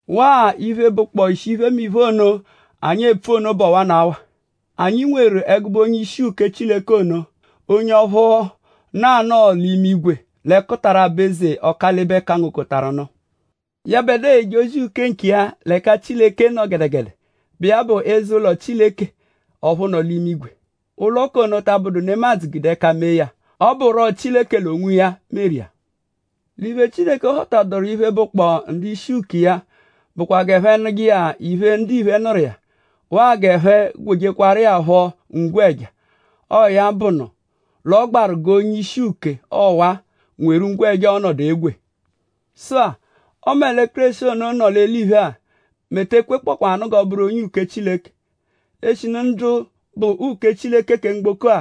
Waa iphe, bụkpoo ishi iphemiphe ono, anyi epfu ono bụ ọwanawa: anyi nweru ẹgube onye-ishi uke Chileke ono; onye ọphu nọ anọo l'imigwe l'ẹkutara aba-eze Ọkalibe-kangokọtaru-nụ. Yẹbedua eje ozi uke nkiya l'ẹka Chileke nọ gẹdegede, bụ iya bụ l'eze-ụlo Chileke ọphu nọ l'imigwe. Ụlo k'ono ta abụdu nemadzụ gude ẹka mee ya. Ọ bụro Chileke l'onwiya meru iya. L'iphe, Chileke họta-doru iphe, bụkpoo ndu-ishi uke iya bụkwa g'ẹphe nụje iya iphe, ndiphe nụru iya; waa g'ẹphe gwejekwaru iya phọ ngwẹja. Ọo ya bụnu l'ọ gbaru g'onye-ishi uke ọwa-a nweru ngwẹja, ọo-nọdu egwe. Sụ-a; ọme Kéreshi ono nọ l'eliphe-a mẹ e te ekwekpọkwanu g'ọ bụru onye uke Chileke; eshinu ndu bụ uke Chileke kẹ mgboko-a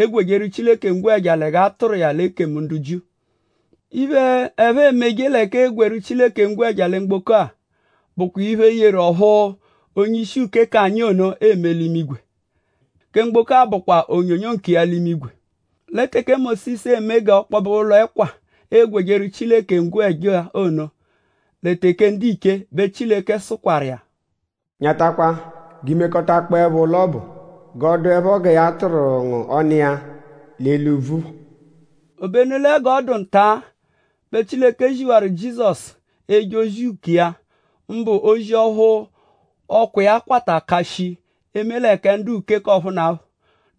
egwejeru Chileke ngwẹja lẹ g'a tụru iya l'ekemu ndu Jiu. Iphe, ẹphe emeje l'ẹka eegwejeru Chileke ngwẹja lẹ mgboko-a bụkwa iphe yeru ọphu onye-ishi uke k'anyi ono eme l'imigwe; kẹ mgboko-a bụkwa onyonyo nkiya l'imigwe. Lẹ teke Mósisu eme g'ọ kpọbe ụlo-ẹkwa, eegwejeru Chileke ngwẹja ono lẹ teke ndiche bẹ Chileke sụkwaru iya: “Nyatakwa g'i mekọtakpoepho ụlo ọbu g'ọ dụepho gẹ ya tụru ngu ọnu iya l'eli úbvú phọ.” Obenu lẹ gẹ ọ dụ nta-a bẹ Chileke ziwaru Jizọsu eje ozi uke iya; mbụ ozi ọphu ọkwa iya kwata ka shii; eme lẹ kẹ ndu-uke k'ọphunapho.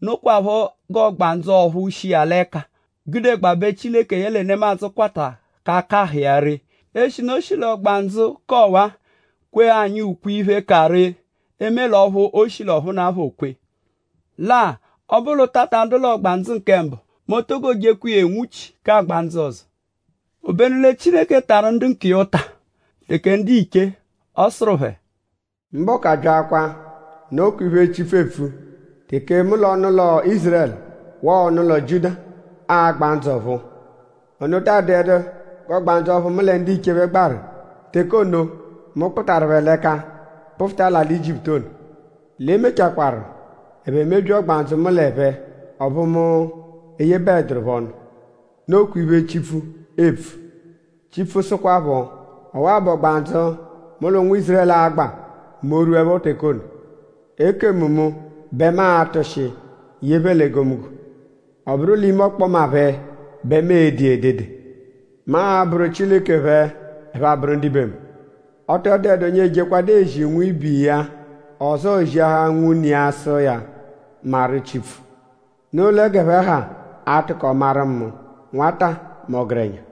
Nokwaphọ g'ọgbandzu ọphu shi iya l'ẹka o gude gudegbabẹ Chileke yẹle nemadzụ kwata ka akahụ iya ree; eshinu o shi l'ọgbandzu k'ọwa-a; kwee anyi ukwe-iphe, ka ree; eme l'ọphu o shi l'ọphunapho kwee. Lẹ-a; ọ -bụ l'ụta ta adụ l'ọgbandzu kẹ mbụ m'o to jekwa iya enwuchi k'agba ndzụ ọzo. Obenu lẹ Chileke tarụ ndu nkiya ụta teke ndiche. Ọ sụru phẹ: “Mbọku abyakwa; nokwa iphe, Chipfu epfu; teke mu l'ọnu-ụlo Ízurẹlu waa ọnu-ụlo Jiuda a-gba ndzụ ọ̀phúú. Ono taa dụedu g'ọgbandzu ọphu mu lẹ ndiche phẹ gbaru teke ono, mu kpụtaru phẹ l'ẹka kpụfuta l'alị Ijiputu ono. L'e mechakwaaru; ẹphe mebyia ọgbandzu mu l'ẹphe; ọphu mu eyebaẹduru phẹ ọnu. Nokwa iphe, Chipfu eepfu. Chipfu sụkwapho: Ọwa-a bụ ọgbandzu mu l'ụnwu Ízurẹlu a-gba mẹ o -rwuẹpho teke ono. Ekemu mu bẹ mu a-tụshi ye phẹ l'egomunggo. Ọ bụru l'ime ọkpoma phẹ bẹ mu e-de iya edede. Mu abụru Chileke phẹ; ẹphe abụru ndibe mu. Ọ tọ dụedu onye ejekwadu ezi nwibe iya; ọzoo ziahaa nwune iya sụ iya: ‘Maru Chipfu’. Noo lẹ g'ẹphe ha a-tụko maru mu; nwata mẹ ọgerenya.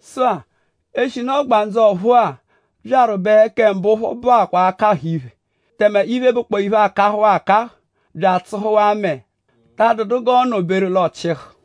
Sụ-a; eshinu ọgbandzu-ọ̀phúú-a byaru bẹ kẹ mbụ phọ bụakwa akahụ-iphe. Tẹme iphe, bụkpoo iphe, akahụwaa akahụ bya atsụhuwaa mẹe ta adụdu g'ọono-beru; l'oo-chịhu.